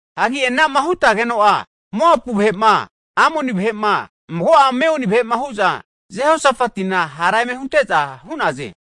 Hagi ana'ma hutegeno'a, Moapu vahe'ma, Amoni vahe'ma, mago'a Meuni vahe'ma hu'za Jehosafatina hara eme hunte'za hu'naze.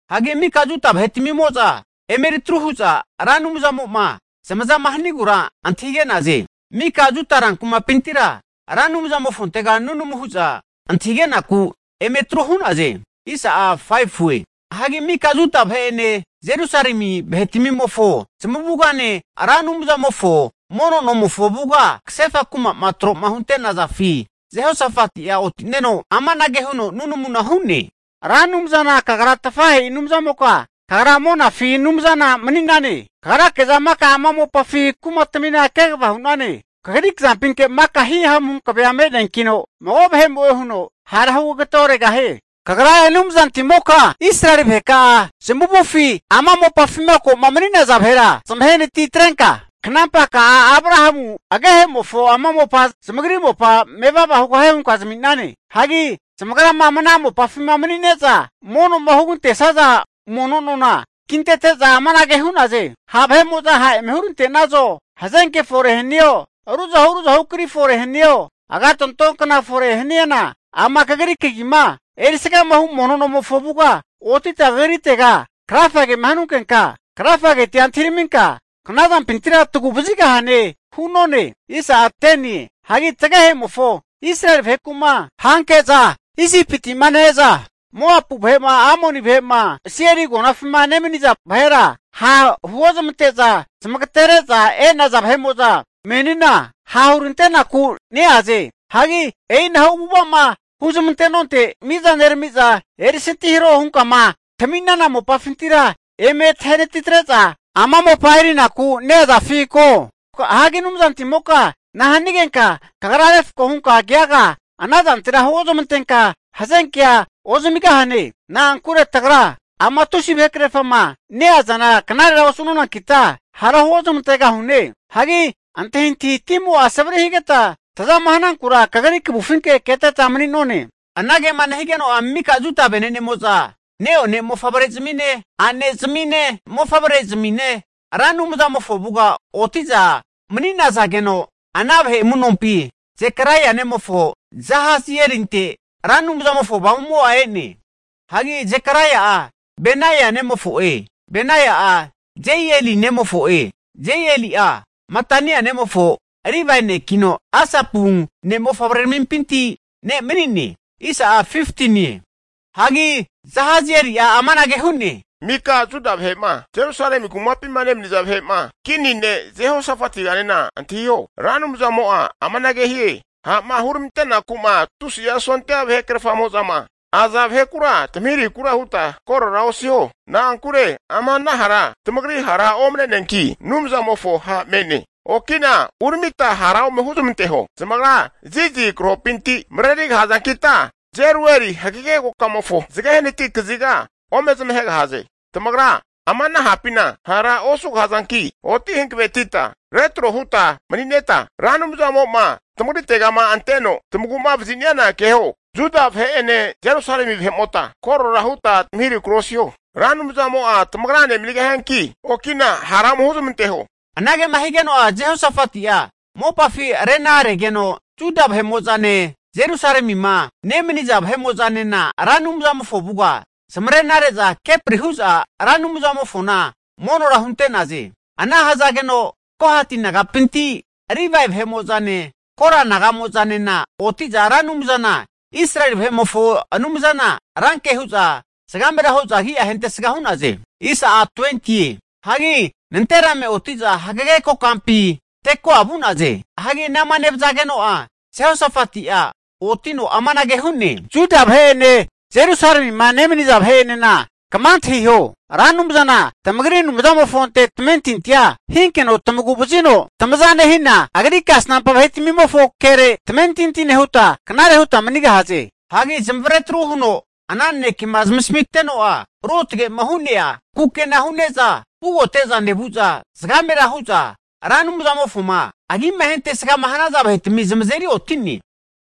Hagi mika Juda vahetmimo'za emeri atru hu'za Ra Anumzamo'ma zamaza hanigura antahige'naze. Mika Juda rankumapintira Ra Anumzamofontega nunamu hu'za antahige'naku eme atru hu'naze. Hagi mika Juda vahe'ene Jerusalemi vahetmimofo zamavugane Ra Anumzamofo mono nomofo avuga kasefa kuma'ma tro'ma hunte'nazafi Jehosafati'a oti'neno, amanage huno nunamuna hu'ne, Ra Anumzana Kagra tafahe'i Anumzamoka kagra monafi Anumzana mani'nane. Kagrake'za maka ama mopafi kumatmina kegava hu'nane. Kagri kazampinke maka hihamu hankavea me'neankino, mago vahe'mo'e huno hara hugageteoregahie. Kagra Anumzantimoka, Israeli vaheka'a zamavufi ama mopafima ko'ma mani'naza vahera zmahenatitrenka, kanampaka'a Abrahamu agehemofo ama mopa zamagri mopa mevava hugahie hunka zami'nane. Hagi zamagra ama ana mopafi mani'ne'za mono'ma hugantesaza mono nona kintete'za amanage hu'naze, ha' eme hurante'nazo, hazenke'za fore hanio, ruzahu ruzahu kri fore hanio, agatonto kna fore haniana ama Kagri kagima erisgahu mono nomofo avuga otita Kagritega krafagema hanunkenka, krafagetia antahiraminka knazanpintira tagu'vazigahane hu'none. Hagi tagehemofo Israeli vaheku'ma hanke'za Isipitima ne-eza Moapu vahe'ma, Amoni vahe'ma' Seiri agonafima nemaniza vahera ha'ma huozmante'za zamagatere'za e'naza vahe'mo'za menina ha' hurantenaku neaze. Hagi e'i anahu avu'ava'ma huzmante'nonte, miza neramiza erisantihareho hunkama tami'nana mopafintira eme tahenatitre'za ama mopa eri'naku neazafi ko? Hagi Anumzantimoka nahanigenka kagra refko hunka keaga ana zantera hunezmantenka hazenkea ozamigahane? Na'ankure tagra ama tusi vahekrerfama neazana knarera osu'nonankita, hara huozmante'gahune. Hagi antahintahi timo'a savari higeta, tazama hanankura kagri kavufinke keteta mani'none. Anage'ma nehigeno'a, mika Juda venenemo'za ne'one mofavrezmine, a'nezamine, mofavre'zmine Ra Anumzamofo avuga oti'za mani'nazageno, ana vahe amu'nompi Zekaraia nemofo Jahazielinte Ra Anumzamofo Avamumo'a e'ne. Hagi Zekaraia'a Benia nemofo'e, Benia'a Jeieli nemofo'e, Jeieli'a Matania nemofo Livae nekino, Asapu ne' mofavreramimpinti ne' mani'ne. Hagi Jahazieli'a amanage hu'ne, Mika Juda vahe'ma, Jerusalemi kumapima nemaniza vahe'motane kini ne' Jehosafetiganena antahiho, Ra Anumzamo'a amanage hie, ha'ma huramante'naku'ma, tusi'a sondia vahekrerfamo'zama aza vahekura tamahirahikura huta korora osiho, na'ankure ama hara tamagri hara omne'neanki, Anumzamofo ha' me'ne. Oki'na uramita hara ome huzmanteho. Zamagra Zizi krahopinti marerigahazankita Jerueli hagege kokamofo zage hanati kaziga ome zamagegahaze. Tamagra ama ana hapina hara osugahazanki, oti hankavetita retrohuta manineta Ra Anumzamo'ma tamagritegama anteno tamagu'ma vaziniana keho. Juda vahe'ene Jerusalemi vahe'mota korora nehuta tamahirahikura osiho. Ra Anumzamo'a tamagrane manigahianki, okina hara ome huzmanteho. Anage'ma higeno'a, Jehosafati'a mopafi renaregeno, Juda vahe'mo'zane, Jerusalemima nemaniza vahe'mo'zanena Ra Anumzamofo avuga zamarena re'za kepri hu'za Ra Anumzamofona monora hunte'naze. Ana hazageno Kohati nagapinti Livae vahe'mo'zane, Kora naga'mo'zanena oti'za Ra Anumzana Israeli vahe'mofo Anumzana ranke hu'za zagamera hu'za agi'a ahentesga hu'naze. Hagi nanterame oti'za hagege kokampi Tekoa vu'naze. Hagi anama nevazageno'a, Jehosafati'a otino amanage hu'ne, Juda vahe'ene Jerusalemima nemaniza vahe'enena kama antahiho, Ra Anumzana tamagri Anumzamofonte tamentintia hinkeno tamagu vazino tamaza nehina, Agri kasnampa vahetmimofo kere tamentinti nehuta, knarera huta manigahaze. Hagi zamavare atru huno ana nanekema zmasamiteno'a, ruotge'ma hu'nea kukena hu'neza vugote'za nevu'za zagamera hu'za Ra Anumzamofoma agima ahentesgama hanaza vahetami zamazeri oti'ne.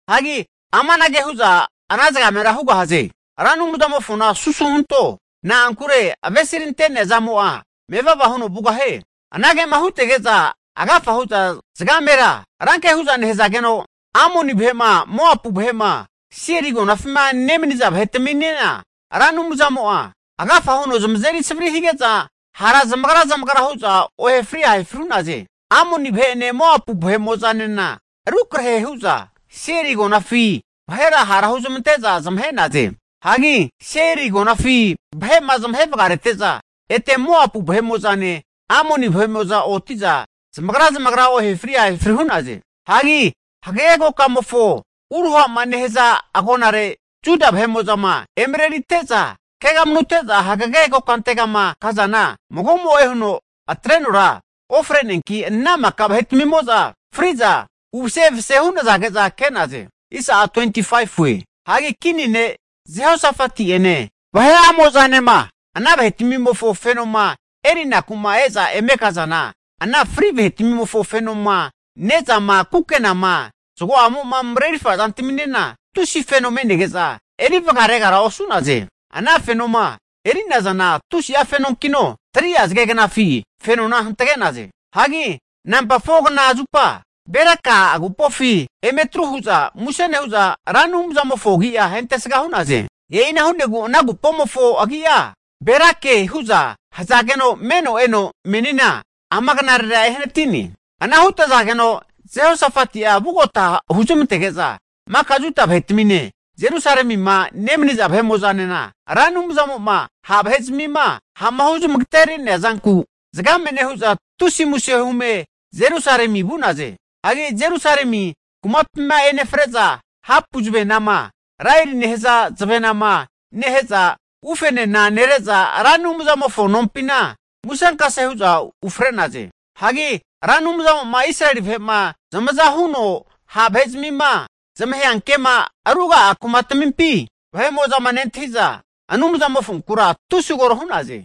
Hagi anama hutege'za amanage hu'za ana zagamera hu'naze, Ra Anumzamofona susu huntone, na'ankure avesirante'nea zamo'a mevava huno vugahie. Anagema hutege'za agafa hu'za zagamera ranke hu'za nehazageno Amoni vahe'ma, Moapu vahe'ma, Seiri agonafima nemaniza vahetaminena Ra Anumzamo'a agafa huno zamazeri savri hige'za, hara zamagra zamagra hu'za ohefri ahefria hu'naze. Amoni vahe'ene Moapu vahe'mo'zanena rukrahe hu'za, Seiri agonafi vahera hara huzmante'za zamahe'naze. Hagi Seiri agonafi vahe'ma zamahe vagamarete'za, ete Moapu vahe'mo'zane Amoni vahe'mo'za oti'za zamagra zamagra ohefri ahefri hu'naze. Hagi hagege kokamofoma uruha'ma nehaza agonare Juda vahe'mo'za emarerite'za, kegamanute'za hagege kokantegama kazana mago'mo'e huno atre'nora ofre'neanki ana maka vahetmimo'za fri'za uvase evase hu'nazage'za ke'naze. Hagi kini ne' Jehosafati'ene vahe'amo'zanema ana vahetmimofo fenoma erinaku'ma e'za eme kazana, ana fri vahetmimofo fenoma, ne'zama, kukenama, zago'amo mareri zantaminena, tusi feno me'nege'za eri vagaregara osu'naze. Ana fenoma eri'nazana tusi'a fenonkino, 3'a zage knafi fenona hantage'naze. Hagi namba 4kna zupa Beraka agupofi emeri tru hu'za muse nehu'za, Ra Anumzamofo agi'a ahentesga hu'naze. E'ina hu'negu ana agupomofo agia Berake (Berakaema hu'nena asomure hu'ne) hu'za hazageno meno eno menina ama knarera ehanati'ne. Ana hutazageno Jehosafati'a vugota huzmantege'za maka Juda vahetamine, Jerusalemima nemaniza vahe'mo'zanena Ra Anumzamo'ma ha' vahe'zmima ha'ma huzmagaterea zanku zagame nehu'za tusi muse hume Jerusalemi vu'naze. Hagi Jerusalemi kumapima enefre'za, hapu zavenama, laerie nehaza zavenama nehe'za, ufenena nere'za Ra Anumzamofo nompina musenkase hu'za ufre'naze. Hagi Ra Anumzamo'ma Israeli vahe'ma zamaza huno ha' vahezmima zamaheankema ruga'a kumatmimpi vahe'mo'zama nentahi'za, Anumzamofonkura tusi koro hu'naze.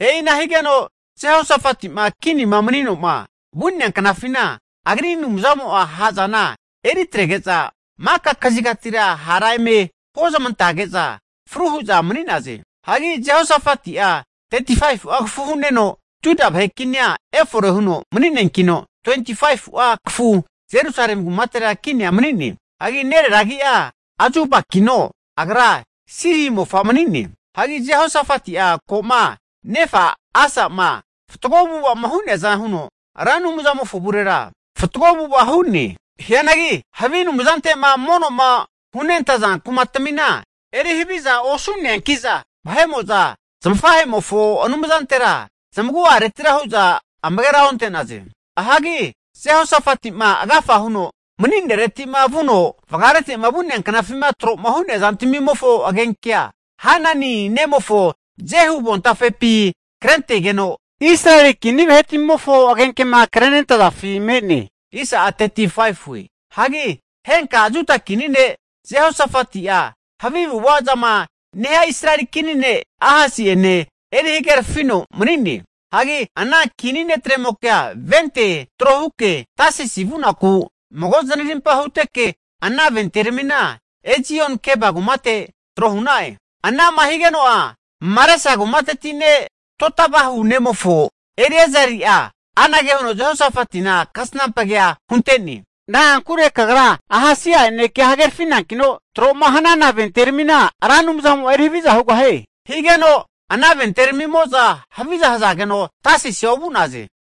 E'ina higeno Jehosafeti'ma kinima mani'noma vu'nea knafina, agri Anumzamo'a ha'zana eri atrege'za maka kazigatira hara eme huozmantage'za fru hu'za mani'naze. Hagi Jehosafati'a 35'a kafu hu'neno Juda vahe kinia efore huno mani'neankino, 25'a kafufi Jerusalemi kumatera kinia mani'ne. Hagi nerera agia Azubakino, agra Silhi mofa mani'ne. Hagi Jehosafati'a ko'ma nefa Asa'ma fatgo avu'ava'ma hu'neaza huno, Ra Anumzamofo avurera fatgo avu'ava hu'ne. Hianagi havi anumzante'ma mono hunentaza kumatmina eri haviza osu'neanki'za, vahe'mo'za zmafahemofo Anumzantera zamagu'aretira hu'za amagera onte'naze. Hagi Jehosafati'ma agafa huno kinima mani'neretima vuno vagamaretema vu'nea knafima tro'ma hu'nea zantmimofo agenkea, Hanani nemofo Jehu avontafepi krentegeno, Israeli kini vahetmimofo agenkema krentenazafi me'ne. Hagi henka Juda kini ne' Jehosafati'a havi avu'avazama nehia Israeli kini ne' Ahasia'ene eri hagerafino mani'ne. Hagi ana kini netremokea vente trohuke Tasisi vunaku mago zanarimpa huteke, ana venteramina Ezion-Geba kumate trohu'na'e. Ana'ma nehakeno'a higeno'a Maresa kumateti ne' Dodavahu nemofo Eliezeri'a anage huno Jehosafatina kasnampa kea hunte'ne, Na'ankure kagra Ahasia'ene kea hagerafinankino, tro'ma hana venteramina Ra Anumzamo'a eri haviza hugahie. Higeno ana venteramimo'za haviza hazage'za, Tasisia ovu'naze.